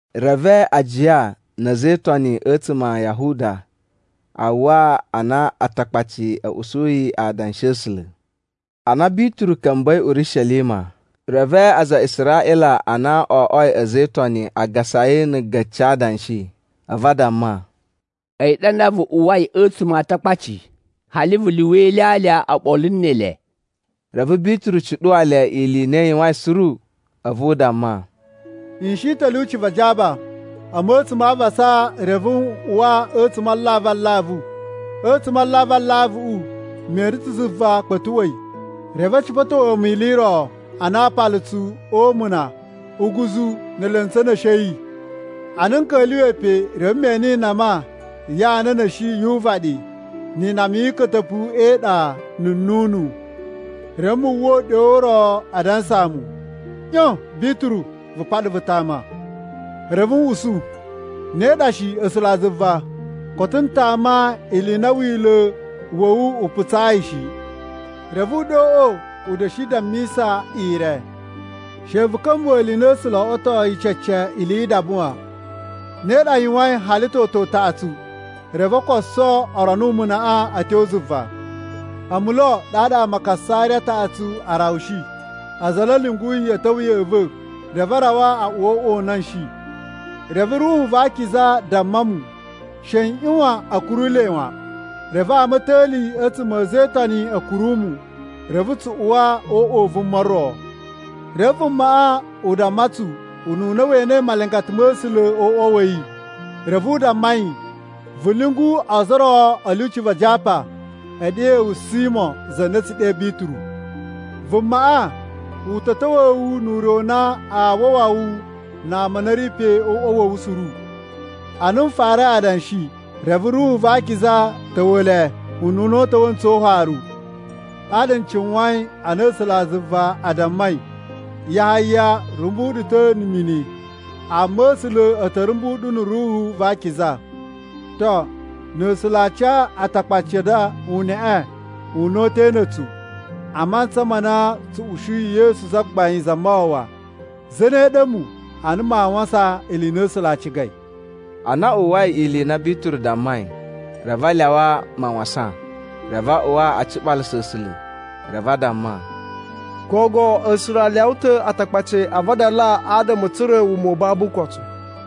Reve ajiya na̱ a̱za̱ e Itoni a̱tsuma̱ a Yahuda a uwwa a na Atakpaci a̱ usuyi adanshi a̱ A̱sula̱. Ana Bituru ka̱mba̱i Urishelima, reve aza a Israꞌila a na o oꞌwoi a̱za̱ e Itoni a gasa yi na̱ a̱ga̱ci a adanshi. A̱vu a damma, “A̱yi ɗa nda vu uwai a̱tsuma̱ a Atakpaci, hali vu lyuwa ilyalya oɓolo ne ele!” Reve Bituru cuɗuwa le ili i na i yuwain suru. A̱vu u damma, “N shi ta̱ a̱ lyuci va Japa a̱mu a̱tsuma̱ a avasa, reve n uwa a̱tsuma̱ a alavu alavu. A̱tsuma̱ a alavu alavuꞌu me ene ta̱ zuva kpa̱tuꞌwa̱i, reve a̱ cipa̱towa̱ mu ili i ro ana aapalutsu o umuna uguzu ne elentsu a̱ na̱shi a̱ yi. Ana n ka̱lyuwa̱i pe, reve me ene inama ya ana a̱ na̱shi yu uvaɗi, ni inama yi ika̱ta̱pu e iɗa, na̱ nnunu. Reve mu uwwa uɗyo u ro adansa mu, ‘ꞌYon Bituru! Vu paɗa vu tama.’ “Reve n usu, ‘Ne ɗa shi A̱sulazuva! Koto n tama ili i na Wila̱ wa̱ wu u putsayi shi.’ “Reve uɗyoꞌo u da̱shi dammisa ire, ‘She vu ka̱mbuwa̱ ili i na A̱sula̱ o oꞌwotoi cece ili yi idaba wan.’ Ne ɗa a yuwain hali toto utaꞌatsu, reve o koso o rono umunaꞌa a̱ tyo zuva. “A̱mu lo ɗaɗa ama a Kasariya a taꞌatsu a rawushi, aza a na a̱ lyunguyi a̱ ta̱wa̱ ya̱ꞌa̱ va̱, reve a rawa o uꞌwa u na n shi. Reve Ruhu va Akiza damma mu, she n ꞌyuwan a̱ kuru le wan. Reve ama a̱ ta̱li a̱tsuma̱ a̱ a̱za̱ e Itoni a̱ kuru mu, reve tsu uwa o uꞌwa u vuma ro. Reve vumaꞌa u damma tsu ununa we enei malingata ma̱ A̱sula̱ o uꞌwa wa̱ yi. Reve u damma yi, ‘Vu lyungu ozo o ro a̱ lyuci va Japa e ɗewe wu Simo za na a̱ tsu ɗe Bituru. Vumaꞌa u ta̱ ta̱wa̱a̱ wu nu ure u na aa wawa wu na ama a na a̱ ri pe o uꞌwa wa̱ wu suru.’ “Ana n farai adanshi, reve Ruhu va Akiza ta̱wa̱ le ununa u ta̱wa̱ ntsu o ufaru. Ɗaɗa n cuwain a na A̱sulazuva a dammai, ‘Yahaya rumbu ɗu ta̱ na̱ mini, amma A̱sula̱ a̱ ta̱ rumbu ɗu na̱ Ruhu va Akiza.’ To, na̱ A̱sula̱ a ca Atakpaci a nda uneꞌe una̱ta̱ na̱ a̱tsu a mantsa ma na tsu ushiyi Yesu Zagbain Zamawawa, zane ɗa a̱mu a na maa wasan ili i na A̱sula̱ a cigai?” Ana a uwwai ili i na Bituru dammai, reve a lyawa mawasan. Reve a uwa a ciɓalasa A̱sula̱, reve a damma, “Gogo A̱sula̱ a lyawa ta̱ Atakpaci a vadala adama a̱ tsura̱ wuma u babu ukotu!”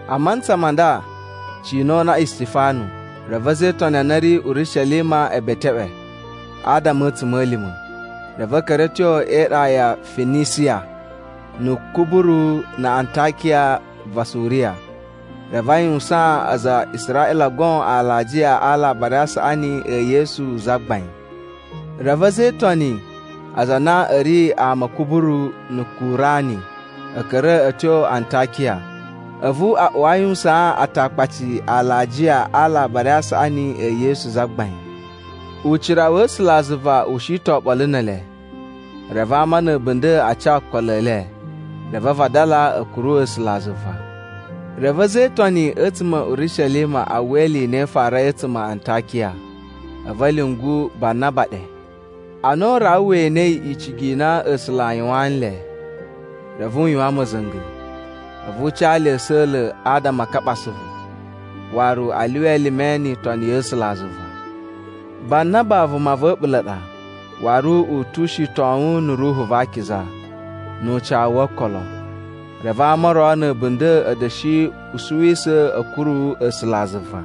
A mantsa ma nda cina o una Istifanu, reve a̱za̱ e Itoni a na a̱ ri Urishelima e beteꞌwe adama a̱ a̱tsuma̱lima̱. Reve a̱ ka̱ra̱ a̱ tyo e iɗa ya Finisiya na̱ Kuburu na̱ Antakiya va Suriya. Reve a yuwusaan aza a Israꞌila goon alajiya a Alabari a Saꞌani e Yesu Zagbain. Reve a̱za̱ e Itoni aza a na a̱ ri ama a̱ Kuburu na̱ Kurani, a̱ ka̱ra̱ a̱ tyo Antakiya, a̱vu a uwa a yuwusaan Atakpaci alajiya a Alabari a Saꞌani e Yesu Zagbain. Ucira wa̱ A̱sulazuva u shi ta̱ oɓolo ne ele, reve ama na̱ a̱bunda̱ a ca okolo e le. Reve a vadala a̱ kuru A̱sulazuva. Reve a̱za̱ e Itoni a̱tsuma̱ a̱ Urishelima a uwwa ili i na i farai a̱tsuma̱ a Antakiya, a̱vu a̱ lyungu Banaba ɗe. Ana u rawa we enei icigi i na A̱sula̱ a yuwaan nle, reve u yuwan ma̱za̱nga̱. A̱vu u ca le a̱sa̱la̱ adama a kaɓa asuvu, waru a lyuwa elime ni itoni ya̱ A̱sulazuva. Banaba vuma va̱ a̱ɓula̱ ɗa, waru u tu ushitowun na̱ Ruhu va Akiza nu ucawu wo okolo. Reve ama o ro na̱ a̱bunda̱ a̱ da̱shi usuwisa̱ a̱ kuru A̱sulazuva.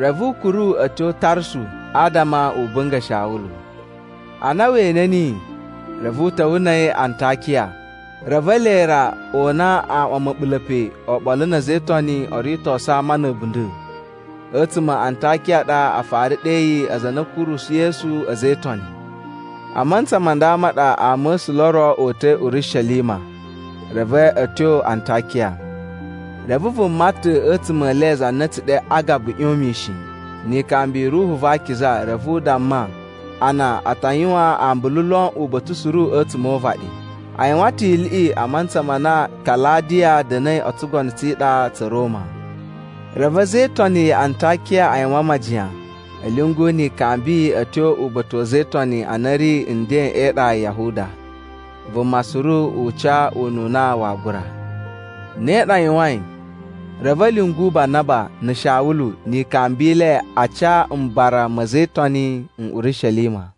Reve u kuru a̱ tyo Tarsu adama u bunga̱ Shawulu. Ana we ene niyi reve u ta̱wa̱ na̱ a̱yi Antakiya. Reve ele ra o una aaꞌwan ma̱ɓula̱ pe oɓolo na̱ a̱za̱ e Itoni oo ritosu ama na̱ a̱bunda̱. A̱tsuma̱ a Antakiya a ɗa a fara ɗeyi aza a na a̱ kurusu Yesu “A̱za̱ e Itoni.” A mantsa ma nda ma ɗa ama̱sula̱ o ro o uta̱i Urishelima reve a̱ tyo Antakiya. Reve vuma ta̱ a̱tsuma̱ e le za na a̱ tsu ɗe Agabu ꞌyon mishin. Ni ikambi i Ruhu va Akiza, reve u damma a na a ta yuwan ambulu lon uba̱ta̱ suru a̱tsuma̱ o uvaɗi. A yuwan ta̱ iliꞌi a mantsa ma na Kaladiya da̱na̱i o tsugono tsi iɗa tsa̱ Roma. Reve a̱za̱ e Itoni ya Antakiya a yuwan majiyan a̱ lyungu ni ikambi a̱ tyo uba̱ta̱ wa̱ a̱za̱ e Itoni a na a̱ ri nden e iɗa ya Yahuda. Vuma suru u ca ununa waa gura. Ne ɗa a yuwain, reve a̱ lyungu Banaba na̱ Shawulu ni ikambi i le a ca mbara ma̱ a̱za̱ e Itoni n Urishelima.